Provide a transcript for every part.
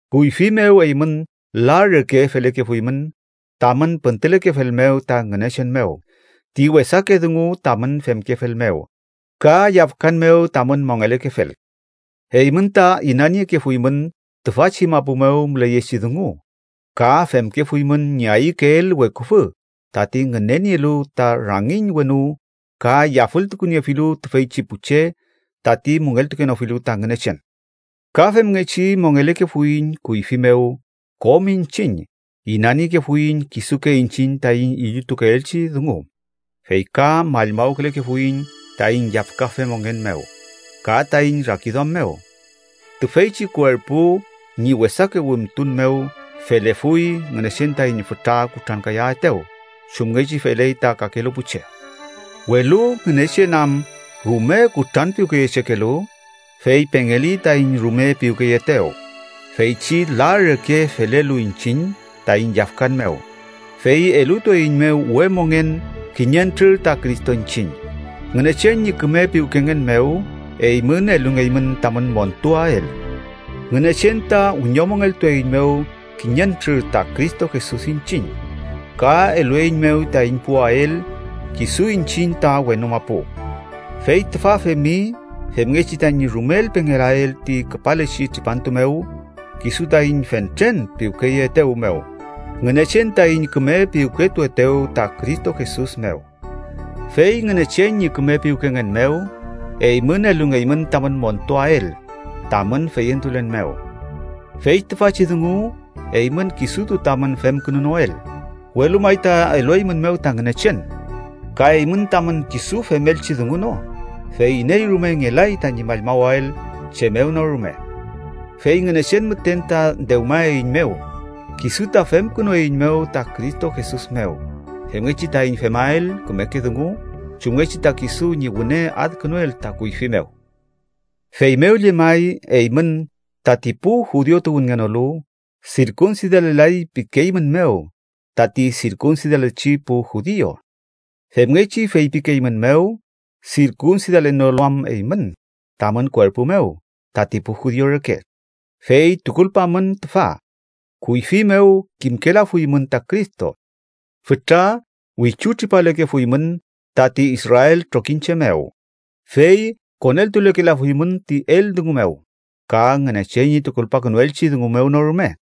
Kuyfi mew eymün la reke felekefuymün tamün püntülekefel mew ta Ngünechen mew ti wesake dungu tamün femkefel mew ka yafkan mew tamün mongelekefel. Eymün ta inaniekefuymün tüfachi mapu mew müleyechi dungu, ka femkefuymün ñi ayükeel weküfü tati ngünenielu ta rangiñ wenu ka yafültukuniefilu tüfeychi pu che tati müngeltukenofilu ta Ngünechen. Ka femngechi mongelekefuiñ kuyfi mew kom iñchiñ. Inaniekefuiñ kisuke iñchiñ taiñ illutukeelchi dungu, fey ka mallmawkülekefuiñ taiñ yafkafe mongen mew ka taiñ rakiduam mew. Tüfeychi kuerpu ñi wesake wimtun mew felefuy Ngünechen taiñ fütra kutrankayaetew, chumngechi feley ta kakelu pu che. Welu Ngünechen am rume kutranpiwkeyechekelu, fey pengeli taiñ rume piwkeyeetew feychi la reke felelu iñchiñ taiñ yafkan mew, fey elutueiñmew we mongen kiñentrür ta Cristo iñchiñ. Ngünechen ñi küme piwkengen mew eymün elungeymün tamün montuael. Ngünechen ta wiñomongeltueiñmew kiñentrür ta Cristo Jesus iñchiñ, ka elueiñmew taiñ puwael kisu iñchiñ ta wenu mapu. Fey tüfa femi femngechi tañi rumel pengelael ti küpalechi tripantu mew kisu taiñ fentren piwkeyeetew mew, Ngünechen taiñ küme piwketuetew ta Cristo Jesus mew. Fey Ngünechen ñi küme piwkengen mew, eymün elungeymün tamün montuael tamün feyentulen mew. Fey tüfachi dungu eymün kisutu tamün femkünunoel, welu may ta elueymünmew ta Ngünechen. Ka eymün tamün kisu femelchi dungu no, fey iney rume ngelay tañi mallmawael chem mew no rume. Fey Ngünechen müten ta dewmaeiñmew. Kisu ta femkünueiñmew ta Cristo Jesus mew, femngechi taiñ femael kümeke dungu chumngechi ta kisu ñi wüne adkünuel ta kuyfi mew. Feymew llemay, eymün, tati pu judiu tuwünngenolu, sirkunsidalelay pikeeymünmew tati sirkunsidalechi pu judiu. (Femngechi feypikeeymünmew sirkunsidalenolu am eymün tamün kuerpu mew tati pu judiu reke.) Fey tukulpamün tüfa: kuyfi mew kimkelafuymün ta Cristo. Fütra wichutripalekefuymün tati Israel trokiñche mew, fey koneltulekelafuymün ti eldungu mew ka Ngünechen ñi tukulpakünuelchi dungu mew no rume.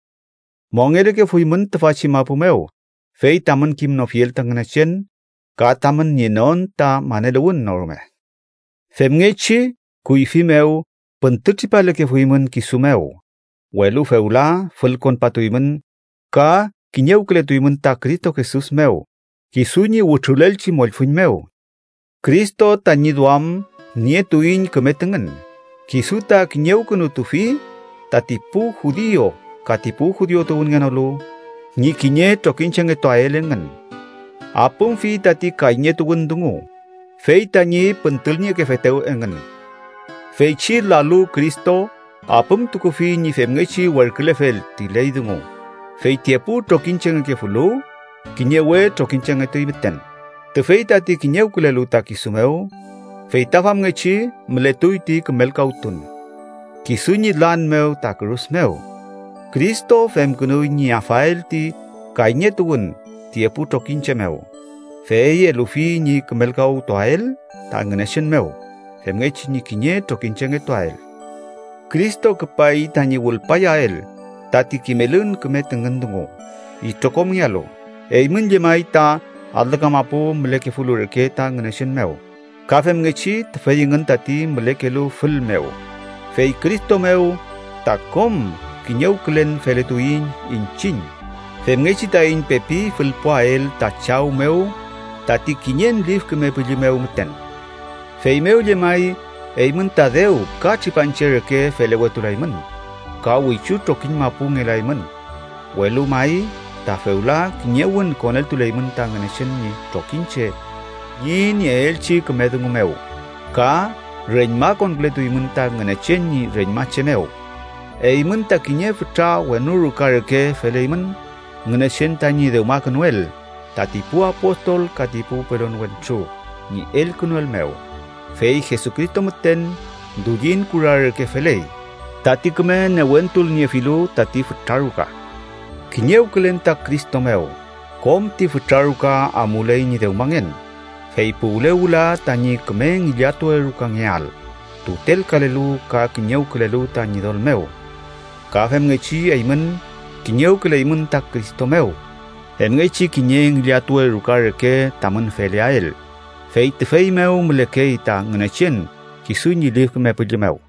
Mongelekefuymün tüfachi mapu mew, fey tamün kimnofiel ta Ngünechen ka tamün nienon ta maneluwün no rume. Femngechi kuyfi mew püntütripalekefuymün kisu mew, welu fewla fülkonpatuymün ka kiñewkületuymün ta Cristo Jesus mew kisu ñi wütrulelchi mollfüñ mew. Cristo tañi duam nietuiñ küme tüngün. Kisu ta kiñewkünutufi tati pu judiu ka ti judiu tuwünngenolu ñi kiñe trokiñchengetuael engün. Apümfi tati kayñetuwün dungu, fey tañi püntülniekefetew engün. Feychi lalu Cristo apümtukufi ñi femngechi werkülefel ti ley dungu, fey ti epu trokiñchengekefulu, kiñe we trokiñchengetuy müten, tüfey tati kiñewkülelu ta kisu mew. Fey ta famngechi mületuy ti kümelkawtun. Kisu ñi lan mew ta kürus mew, Cristo femkünuy ñi afael ti kayñetuwün ti epu trokiñche mew, fey elufi ñi kümelkawtuael ta Ngünechen mew, femngechi ñi kiñe trokiñchengetuael. Cristo küpay tañi wülpayael tati kimelün küme tüngün dungu itrokomngealu eymün llemay ta alü kamapu mülekefulu reke ta Ngünechen mew ka femngechi tüfey engün tati mülekelu fül mew. Fey Cristo mew ta kom kiñewkülen feletuiñ iñchiñ femngechi taiñ pepi fülpuael ta Chaw mew tati kiñen Lif Küme Püllü mew müten. Feymew llemay, eymün ta dew ka tripanche reke felewetulaymün, ka wichu trokiñ mapu ngelaymün, welu may ta fewla kiñewün koneltuleymün ta Ngünechen ñi trokiñche ñi nieelchi küme dungu mew, ka reñmakonkületuymün ta Ngünechen ñi reñmache mew. Eymün ta kiñe fütra wenu ruka reke feleymün Ngünechen tañi dewmakünuel tati pu apostol ka ti pu pelon wentru ñi elkünuel mew, fey Jesucristo müten dullin kura reke feley, tati küme newentulniefilu tati fütra ruka. Kiñewkülen ta Cristo mew, kom ti fütra ruka amuley ñi dewmangen, fey puwle wüla tañi küme ngillatuwe rukangeael tutelkalelu ka kiñewkülelu ta Ñidol mew. Ka femngechi eymün, kiñewküleymün ta Cristo mew, femngechi kiñe ngillatuwe ruka reke tamün feleael, fey tüfey mew mülekey ta Ngünechen kisu ñi Lif Küme Püllü mew.